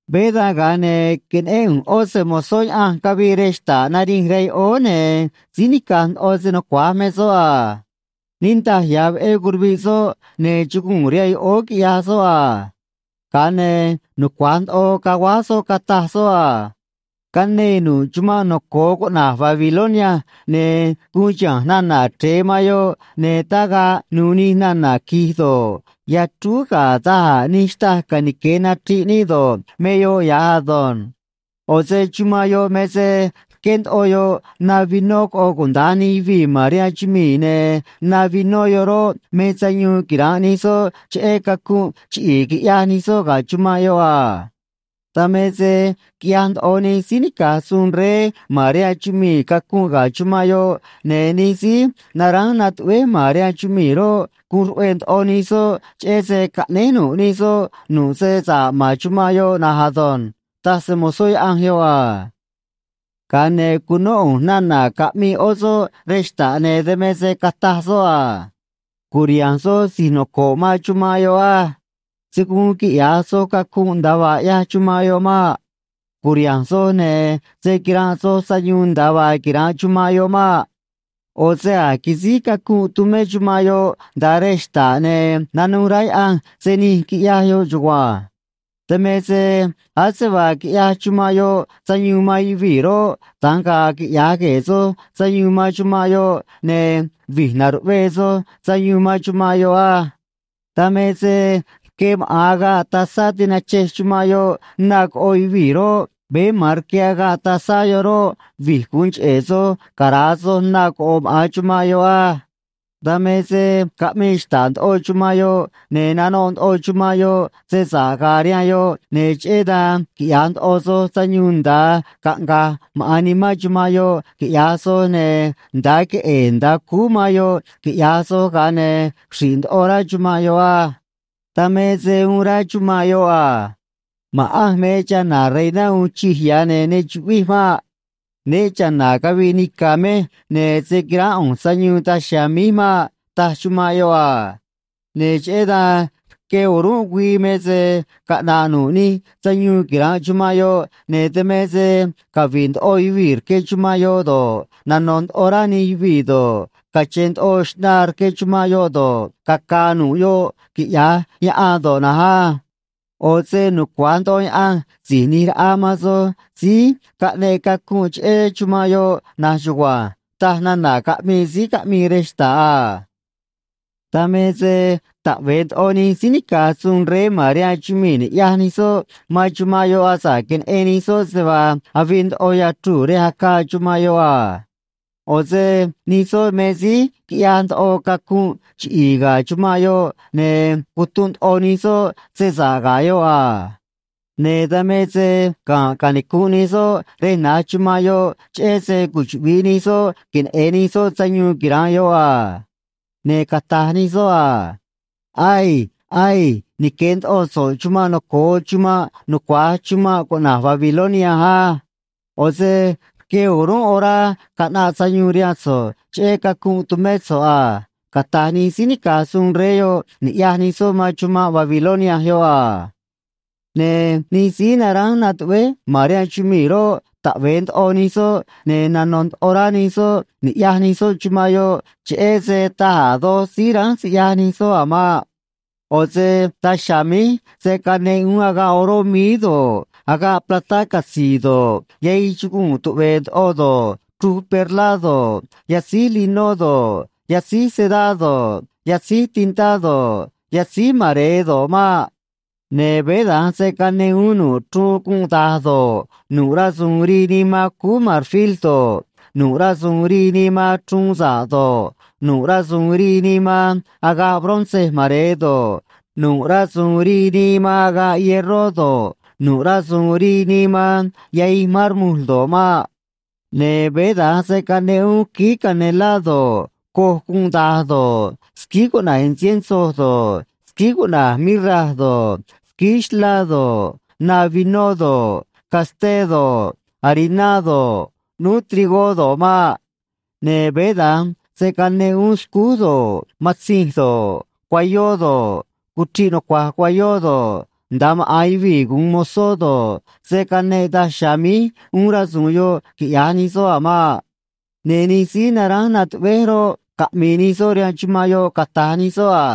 Veé dan, ga̱a ne̱ queneꞌén ꞌu̱nj ꞌó se‑mo̱zó Yaꞌanj cavii rej xta̱ꞌ nanij rihaan yoꞌóó, ne̱ síí nica̱j ndoꞌo se nucua̱j me soꞌ a. Niꞌndaj ya̱ veꞌé curuviꞌ soꞌ, ne̱ chuguu̱n rihaan yoꞌóó, quiꞌyaj soꞌ a. Ga̱a ne̱ nucua̱j ndoꞌo caguáj soꞌ, cataj soꞌ a: ―Canee nu̱ꞌ chumanꞌ noco̱o cuꞌna̱j Babilonia, ne̱ guun chiha̱nj nana̱ chre̱e man yoꞌ, ne̱ tagaꞌ nu̱u̱ nij nana̱ qui̱j do̱ꞌ, yachrúú ga̱ da̱j a̱ nij xtâj canique̱ nachriꞌ níꞌ do̱ꞌ, me yoꞌ ya̱j ado̱nj. ꞌO̱ se chumanꞌ yoꞌ me se rqué ndoꞌo yoꞌ na vinó coꞌo cunuda̱nj nij yuvii̱ ma̱n rihaan chumii̱, ne̱ na vinó yoꞌ roꞌ, me sayuun quira̱nꞌ nij soꞌ cheꞌé cacunꞌ chiꞌi̱i̱ quiꞌyaj nij soꞌ ga̱ chumanꞌ yoꞌ a. Dan me se quiꞌyaj ndoꞌo nij síí nica̱j suun rey ma̱n rihaan chumii̱ cacunꞌ ga̱ chumanꞌ yoꞌ, ne̱ nij síí naránj natuꞌvéj ma̱n rihaan chumii̱ roꞌ, guun ruꞌve̱e̱ ndoꞌo nij soꞌ cheꞌé se caꞌnéj nu̱ꞌ nij soꞌ nu̱ꞌ se sa̱ꞌ man chumanꞌ yoꞌ na̱nj ado̱nj ―taj se‑mo̱zó Yaꞌanj yoꞌ a. Ga̱a ne̱ cunó ꞌu̱nj nana̱ caꞌmii ꞌó soꞌ rej xta̱ꞌ, ne̱ dan me se cataj soꞌ a: ―Cu̱riha̱nj soj si̱j noco̱ꞌ manj chumanꞌ yoꞌ á. Se̱ guun quiꞌya̱j soj cacunꞌ nda̱a vaa ꞌyaj chumanꞌ yoꞌ maꞌ. Cu̱riha̱nj soj, ne̱ se̱ quiranꞌ soj sayuun nda̱a vaa quira̱nꞌ chumanꞌ yoꞌ maꞌ. ꞌO̱ se a̱j quisíj cacunꞌ tumé chumanꞌ yoꞌ nda̱a rej xta̱ꞌ, ne̱ nanuj rá Yaꞌanj se nij quiꞌyaj yoꞌ chugua̱nj. Dan me se ase vaa quiꞌyaj chumanꞌ yoꞌ sayuun man yuvii̱ roꞌ, da̱nj ga̱a̱ quiꞌya̱j gue̱e̱ soj sayuun man chumanꞌ yoꞌ, ne̱ vi̱j na̱ruꞌvee soj sayuun man chumanꞌ yoꞌ á. Dan me se rque maꞌa̱n agaꞌ tazá tinachej chumanꞌ yoꞌ na coꞌo yuvii̱ roꞌ, veé ma̱an rque agaꞌ tazá yoꞌ roꞌ, vi̱j gu̱un cheꞌe̱ soj cara̱a soj na coꞌo̱ maꞌa̱n chumanꞌ yoꞌ á. Dan me se caꞌmii xta̱ꞌ ndoꞌo chumanꞌ yoꞌ, ne̱ nanoꞌ ndoꞌo chumanꞌ yoꞌ se sa̱ꞌ ga̱a̱ rihaan yoꞌ, ne̱ cheꞌé dan quiꞌya̱j ndoꞌo soj sayuun nda̱a caꞌnga̱j maꞌa̱n nimán chumanꞌ yoꞌ, quiꞌya̱j soj, ne̱ nda̱a queꞌe̱e̱ nda̱a cúú man yoꞌ, quiꞌya̱j soj, ga̱a ne̱ xri̱ꞌ ndoꞌo rá chumanꞌ yoꞌ á. Dan me se uun rá chumanꞌ yoꞌ a: “Ma̱ꞌanj me chana̱ reiná uun chij ya̱, ne̱ ne chuꞌvij maꞌ. Né cha̱na̱ caviꞌ nica̱ mej, ne̱ se̱ quiránꞌ ꞌu̱nj sayuun daj chiha̱a̱ míj maꞌ”, taj chumanꞌ yoꞌ a. Ne̱ cheꞌé dan rque o̱rúnꞌ güii me se caꞌna̱ꞌ nu̱ꞌ nij sayuun quira̱nꞌ chumanꞌ yoꞌ, ne̱ dan me se cavi̱ꞌ ndoꞌo yuvii̱ rque chumanꞌ yoꞌ do̱ꞌ, nano̱ ndoꞌo rá nij yuvii̱ do̱ꞌ, cache̱n ndoꞌo xꞌnaa rque chumanꞌ yoꞌ do̱ꞌ, caca̱a̱ nu̱ꞌ yoꞌ, quiꞌya̱j yaꞌan do̱ꞌ na̱nj á. ꞌO̱ se nucua̱j ndoꞌo Yaꞌanj Si̱j ꞌNi̱j Raꞌa man soj síí caꞌneꞌ cacunꞌ cheꞌé chumanꞌ yoꞌ na̱nj chugua̱nj ―taj nana̱ caꞌmii síí caꞌmii rej xta̱ꞌ a. Dan me se taꞌve̱e ndoꞌo nij síí nica̱j suun rey ma̱n rihaan chumii̱ ni̱ꞌyaj nij soꞌ man chumanꞌ yoꞌ asa̱ꞌ queneꞌen nij soꞌ se vaa avii ndoꞌo yachruu̱ rej acaa chumanꞌ yoꞌ a. ꞌO̱ se nij soꞌ me síí quiꞌyaj ndoꞌo cacunꞌ chiꞌi̱i̱ ga̱ chumanꞌ yoꞌ, ne̱ cutunꞌ ndoꞌo nij soꞌ se sa̱ꞌ ga̱ yoꞌ a. Ne̱ dan me se ga̱nꞌ canicu̱nꞌ nij soꞌ rej na̱j chumanꞌ yoꞌ, cheꞌé se cuchuꞌvi̱ꞌ nij soꞌ queneꞌe̱n nij soꞌ sayuun quira̱nꞌ yoꞌ a. Ne̱ cata̱j nij soꞌ a: ―Aii. Aii. Nique̱ ndoꞌo so̱ꞌ chuma̱nꞌ noco̱o chuma̱nꞌ nucua̱j chuma̱nꞌ cuꞌna̱j Babilonia á. ꞌO̱ se rque o̱rúnꞌ orá caꞌnaꞌ sayuun rihaan so̱ꞌ cheꞌé cacunꞌ tumé so̱ꞌ a ―cata̱j nij síí nica̱j suun rey yoꞌ, ni̱ꞌyaj nij soꞌ man chumanꞌ Babilonia yoꞌ a. Ne̱ nij síí naránj natuꞌvéj ma̱n rihaan chumii̱ roꞌ, taꞌve̱e ndoꞌo nij soꞌ, ne̱ nano̱ ndoꞌo rá nij soꞌ ni̱ꞌyaj nij soꞌ chumanꞌ yoꞌ cheꞌé se taj a̱ doj síí ránj siꞌyaj nij soꞌ a̱ maꞌ. ꞌO̱ se daj chiha̱a̱ míj se̱ caneꞌ uún agaꞌ oró míí do̱ꞌ, agaꞌ platá catzi̱i̱ do̱ꞌ, yahij chuguu̱n tuꞌve̱e̱ ndoꞌo do̱ꞌ, chruj perlá do̱ꞌ, yatzíj linó do̱ꞌ, yatzíj sedá do̱ꞌ, yatzíj tintá do̱ꞌ, yatzíj mare̱e do̱ꞌ maꞌ. Ne̱ veé da̱nj se̱ caneꞌ uún nu̱ꞌ chruun gunꞌ da̱j do̱ꞌ, nu̱ꞌ rasu̱u̱n rii nii man cúú marfil do̱ꞌ, nu̱ꞌ rasu̱u̱n rii nii man chruun sa̱ꞌ do̱ꞌ, nu̱ꞌ rasu̱u̱n rii nii man agaꞌ bronce mare̱e do̱ꞌ, nu̱ꞌ rasu̱u̱n rii nii man agaꞌ hierró do̱ꞌ, nu̱ꞌ rasu̱u̱n rii nii man yahij mármol do̱ꞌ maꞌ. Ne̱ veé da̱nj se̱ caneꞌ uún quíí canelá do̱ꞌ, coj gunꞌ da̱j do̱ꞌ, squíí cuꞌna̱j “incienso” do̱ꞌ, squíí cuꞌna̱j “mirra” do̱ꞌ, squíí xlá do̱ꞌ, na vinó do̱ꞌ, casté do̱ꞌ, hariná do̱ꞌ, ꞌnúú trigó do̱ꞌ maꞌ. Ne̱ veé da̱nj se̱ caneꞌ uún scúj do̱ꞌ, matzinj do̱ꞌ, cuayó do̱ꞌ, cuchriꞌ nucua̱j cuayó do̱ꞌ, nda̱a maꞌa̱n yuvii̱ gu̱un mozó do̱ꞌ, se̱ caneꞌ daj chiha̱a̱ míj uún rasu̱u̱n yoꞌ, quiꞌya̱j nij soꞌ a̱ maꞌ. Ne̱ nij síí naránj natuꞌvéj roꞌ, caꞌmi̱i̱ nij soꞌ rihaan chumanꞌ yoꞌ, cata̱j nij soꞌ a: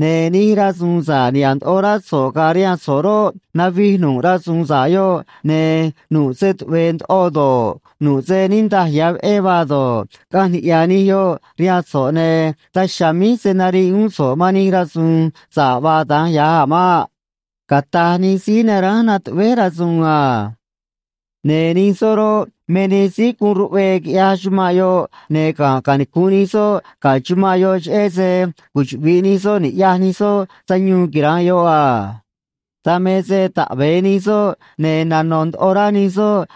―Ne̱ nij rasu̱u̱n sa̱ꞌ niha̱ꞌ ndoꞌo rá so̱ꞌ ga̱a̱ rihaan so̱ꞌ roꞌ, navij nu̱ꞌ rasu̱u̱n sa̱ꞌ yoꞌ, ne̱ nu̱ꞌ se tuꞌve̱e̱ ndoꞌo do̱ꞌ, nu̱ꞌ se niꞌndaj ya̱ veꞌé vaa do̱ꞌ, caꞌanj niꞌya̱ nij yoꞌ rihaan so̱ꞌ, ne̱ daj chiha̱a̱ míj se̱ nariꞌ uún so̱ꞌ man nij rasu̱u̱n sa̱ꞌ vaa da̱nj ya̱j a̱ maꞌ ―cata̱j nij síí naránj natuꞌvéj rasu̱u̱n a. Ne̱ nij soꞌ roꞌ, me nij síí guun ruꞌvee quiꞌyaj chumanꞌ yoꞌ, ne̱ ga̱nꞌ canicu̱nꞌ nij soꞌ ga̱ chumanꞌ yoꞌ, cheꞌé se cuchuꞌvi̱ꞌ nij soꞌ ni̱ꞌyaj nij soꞌ sayuun quira̱nꞌ yoꞌ a. Dan me se taꞌve̱e nij soꞌ, ne̱ nano̱ ndoꞌo rá nij soꞌ,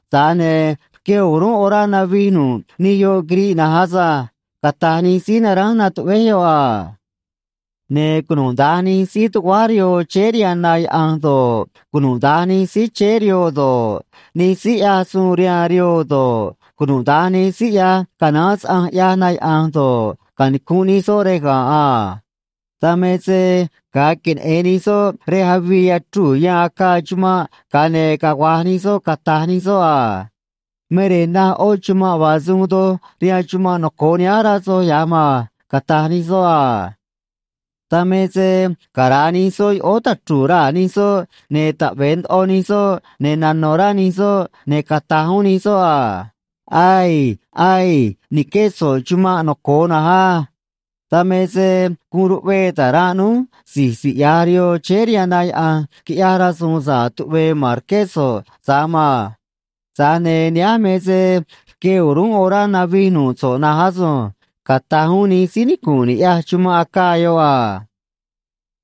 tza̱j ne̱ rque o̱rúnꞌ orá navij nu̱ꞌ nij yoꞌ quiriꞌ na̱nj asânj ―cata̱j nij síí naránj natuꞌvéj yoꞌ a. Ne̱ cunuda̱nj nij síí tuguáj rihoo chéé rihaan na yaꞌa̱nj do̱ꞌ, cunuda̱nj nij síí chéé rihoo do̱ꞌ, nij síí ꞌyaj suun rihaan rihoo do̱ꞌ, cunuda̱nj nij síí ꞌyaj canaán saꞌanj, ꞌyaj na yaꞌa̱nj do̱ꞌ, canicu̱nꞌ nij soꞌ rej ga̱nꞌ a. Dan me se ga̱a queneꞌe̱n nij soꞌ rej avii yachruu̱ yan acaa chumanꞌ, ga̱a ne̱ cagua̱j nij soꞌ, cata̱j nij soꞌ a: ―Me rej naj ꞌó chumanꞌ vaa se uun doj rihaan chumanꞌ noco̱o nihánj, rá soj ya̱j maan ―cata̱j nij soꞌ a. Dan me se cara̱a nij soꞌ yoꞌóó tachru̱u̱ raa̱ nij soꞌ, ne̱ taꞌve̱e ndoꞌo nij soꞌ, ne̱ nano̱ rá nij soꞌ, ne̱ cata̱j uún nij soꞌ a: ―Aii. Aii. Ni̱qué so̱ꞌ chumanꞌ noco̱o na̱nj á. Dan me se guun ruꞌvee ta̱ranꞌ núj si̱j siꞌya̱j rihoo chéé rihaan na yaꞌa̱nj, quiꞌyaj rasu̱u̱n sa̱ꞌ tuꞌve̱e̱ ma̱n rqué so̱ꞌ tza̱j maan. Tza̱j ne̱ nihánj me se rque o̱rúnꞌ orá navij nu̱ꞌ so̱ꞌ na̱nj asunj ―cata̱j uún nij síí nicu̱nꞌ niꞌya̱j chumanꞌ acaa yoꞌ a.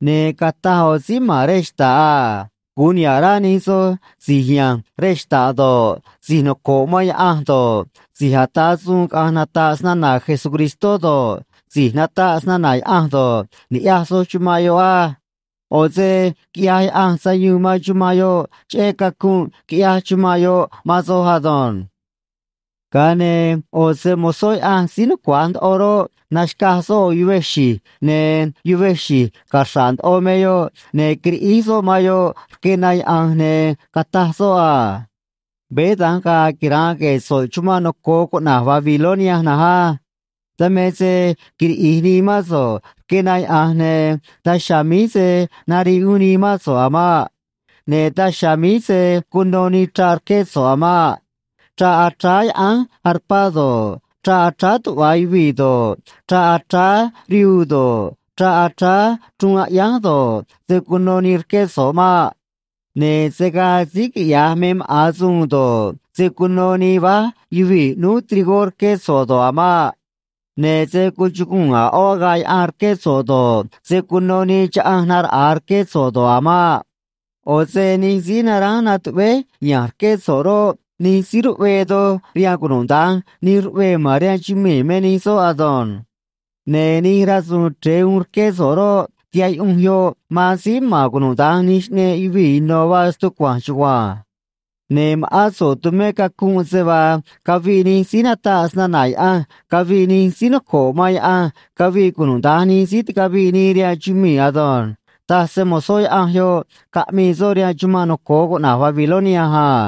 Ne̱ cataj ꞌo̱ síí ma̱n rej xta̱ꞌ a: “Gu̱un niha̱ꞌ rá nij soj si̱j ya̱nj rej xta̱ꞌ do̱ꞌ, si̱j noco̱ꞌ man Yaꞌanj do̱ꞌ, si̱j ata̱ suun caꞌa̱nj nata̱ꞌ snana̱ Jesucristó do̱ꞌ, si̱j nataꞌ snana̱ Yaꞌanj do̱ꞌ, ni̱ꞌyaj soj chumanꞌ yoꞌ á. ꞌO̱ se quiꞌyaj Yaꞌanj sayuun man chumanꞌ yoꞌ cheꞌé cacunꞌ quiꞌyaj chumanꞌ yoꞌ man soj ado̱nj.” Ga̱a ne̱ ꞌo̱ se‑mo̱zó Yaꞌanj síí nucua̱j ndoꞌo roꞌ, naxca̱j soꞌ ꞌo̱ yuvej xi̱j, ne̱ yuvej xi̱j caxra̱ꞌ ndoꞌo me yoꞌ, ne̱ quiriꞌíj soꞌ man yoꞌ rque na yaꞌa̱nj, ne̱ cataj soꞌ a: ―Veé da̱nj ga̱a̱ quira̱nꞌ gue̱e̱ so̱ꞌ chuma̱nꞌ noco̱o cuꞌna̱j Babilonia na̱nj á. Dan me se quiriꞌi̱j nii mán so̱ꞌ rque na yaꞌa̱nj, ne̱ daj chiha̱a̱ míj se̱ nariꞌ uún nii mán so̱ꞌ a̱ maꞌ. Ne̱ daj chiha̱a̱ míj se̱ cuno nii chraꞌ rque so̱ꞌ a̱ maꞌ. Chraꞌ achráá yaꞌánj arpá do̱ꞌ, chraꞌ achráá tuꞌva yuvii̱ do̱ꞌ, chraꞌ achráá rihuu do̱ꞌ, chraꞌ achráá chruun aꞌyánj do̱ꞌ, se̱ cuno nii rqué so̱ꞌ maꞌ. Ne̱ se̱ gaa síí quiꞌya̱j me maꞌa̱n suun do̱ꞌ, se̱ cuno nii váj yuvii̱ ꞌnúú trigó rqué so̱ꞌ do̱ꞌ a̱ maꞌ. Ne̱ se̱ cuchuguu̱n a̱ ꞌó agaꞌ yaꞌan rqué so̱ꞌ do̱ꞌ, se̱ cuno nii chaꞌanj naraꞌa̱a rqué so̱ꞌ do̱ꞌ a̱ maꞌ. ꞌO̱ se nij síí naránj natuꞌvéj ya̱nj rqué so̱ꞌ roꞌ, nij síí ruꞌvee doj rihaan cunuda̱nj nij ruꞌvee ma̱n rihaan chumii̱ me nij soꞌ ado̱nj. Ne̱ nij rasu̱u̱n chre̱e uun rqué so̱ꞌ roꞌ, tihaꞌ yuꞌunj yoꞌ man síí ma̱n cunuda̱nj nij xꞌneꞌ yuvii̱ ino̱ vaa stucua̱nj chugua̱nj. Ne̱ ma̱ꞌán so̱ꞌ tumé cacunꞌ se vaa caviꞌ nij síí nataꞌ snana̱ Yaꞌanj caviꞌ nij síí noco̱ꞌ man Yaꞌanj caviꞌ cunuda̱nj nij síí ticaviꞌ nii rihaan chumii̱ ado̱nj ―taj se‑mo̱zó Yaꞌanj yoꞌ, caꞌmii soꞌ rihaan chumanꞌ noco̱o cuꞌna̱j Babilonia a.